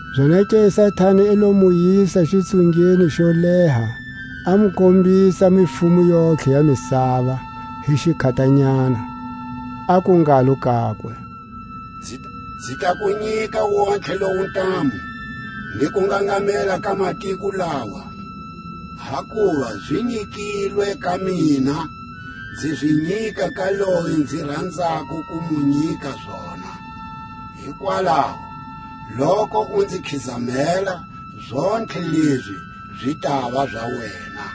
Zonake Satani i lo mu yisa xitsungeni xo leha, a mu kombisa mifumo yontlhe ya misava hi xikhatanyana, aku ngalo kakwe: Nzi ta ku nyika wontihe lowu ntamu, ni kungangamela ka matiko lawa; hakuva zi nyikilwe ka mina; nzi zi nyika ka loyi nzi ranzako ku mu nyika zona. Hikwalaho, loku u nzi khizamela, zontlhe lezi zi tava za wena.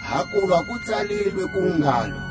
Hakuva ku tsalilwe ku ngalo: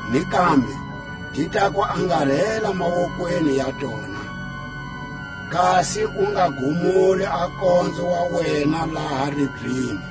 Ni kambe: Ti ta ku angarela mawokweni ya tona, Kasi u nga gumuli a nkonzo wa wena laha ribyeni.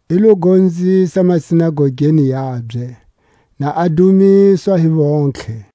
I lo gonzisa masinagogeni yabye, na a dumiswa hi vontlhe.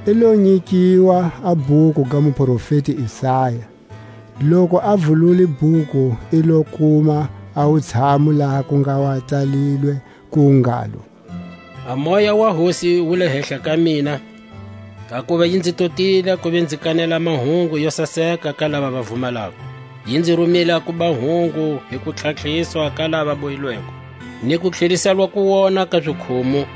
I lo nyikiwa a bhuku ga muprofeti Isaya; loku a vulule bhuku i lo kuma a wutshamu laha ku nga wa tsalilwe ku ngalo: A Moya wa Hosi wu le hehla ka mina, Hakuva yi nzi totile a kuva nzi kanela a mahungu yo saseka ka lava va vumalako; Yi nzi rumile a kuba hungu hi kutlhatlhiswa ka laʼva bohilweko, Ni kutlheliselwa kuwona ka zikhumu,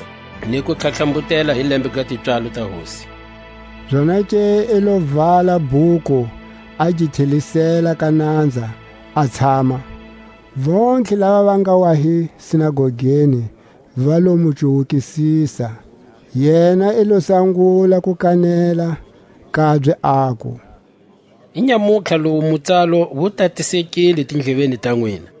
Ni ku tlhatlhambutela hi lembe ga tipswalo ta Hosi. Zonake i lo vala bhuku, a gi tlhelisela ka nanza, a tshama. Vontlhe lava va nga wa hi sinagogeni va lo mu cuwukisisa. Yena i lo sangula ko kanela kabye, aku: Inyamutlha lowu mutsalo wu tatisekile tindleveni ta nwina.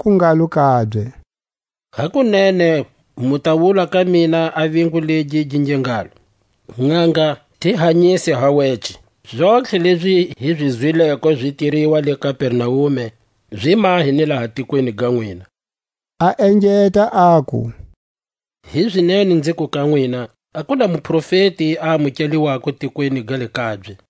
Aku ngalo kabye: Hakunene mu ta wula ka mina a vingu legi gi nge ngalo: Nʼanga, ti hanyise ha wece; zontlhe lezi hi zi zwileko zi tiriwa le Kapernaume, zi mahe ni laha tikweni ga nwina. A engeta aku: Hizinene nziku ka nwina, A ku na muprofeti a amukeliwako tikweni ga le kabye.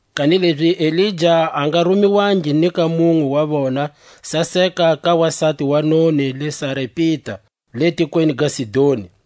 kanilezi Elija a nga rumiwangi ni ka munwe wa vona, saseka ka wasati wa noni le Sarepita, le tikweni ga Sidoni.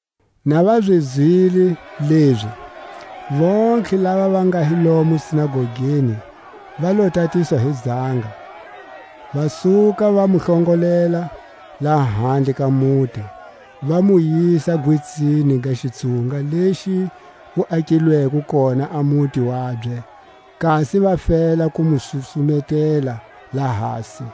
Na va zi zwile lezi, vontlhe lava va nga hi lomu sinagogeni va lo tatiswa hi zanga, va suka, va mu hlongolela lahandle ka muti, va mu yisa gwitsini ga xitsunga lexi wu akilweko kona a muti wabye, kasi va fela ku mu susumetela lahasi.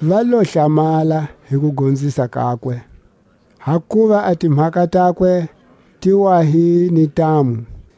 Va lo hlamala hi kugonzisa kakwe, hakuva a timhaka takwe ti wa hi ni ntamu.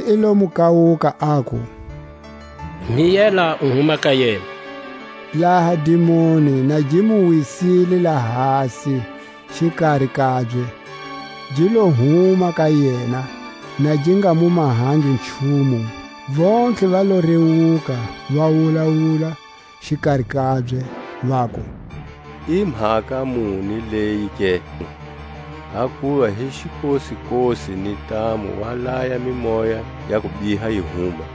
Jesu i lo mu kawuka, aku: Miyela, u huma ka yena! Laha dimoni na gi mu wisile lahasi xikari kabye, gi lo huma ka yena, na gi nga mu mahangi nchumu. Vontlhe va lo rewuka, va wulawula xikari kabye, vaku: I mhaka muni leyi ke? Hakuva hi xikosikosi ni ntamu wa taya a mimoya ya kubiha, yi huma.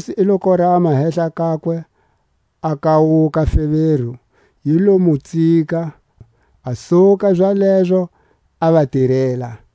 Jesu i lo korama hehla kakwe; a kawuka feveri; yi lo mu tsika, a suka zalezo, a va tirela.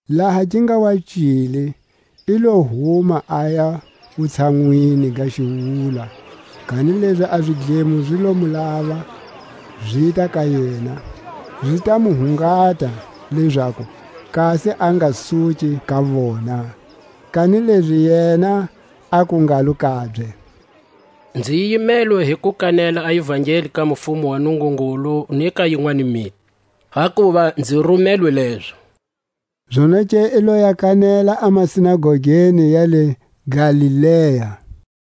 Laha gi nga wa cile, i lo huma aya wutshanwini ga xiwula; kanilezi a zidlemo zi lo mu lava, zita ka yena, zi ta mu hungala lezaku kasi a nga suki ka vona. Kanilezi yena aku ngalo kabye: Nzi yimelwe hi ku kanela a ivangeli ya mufumo wa Nungungulu ni ka yinwani miti; hakuva nzi rumelwe lezo. Zonake i lo ya kanela a masinagogeni ya le Galilea.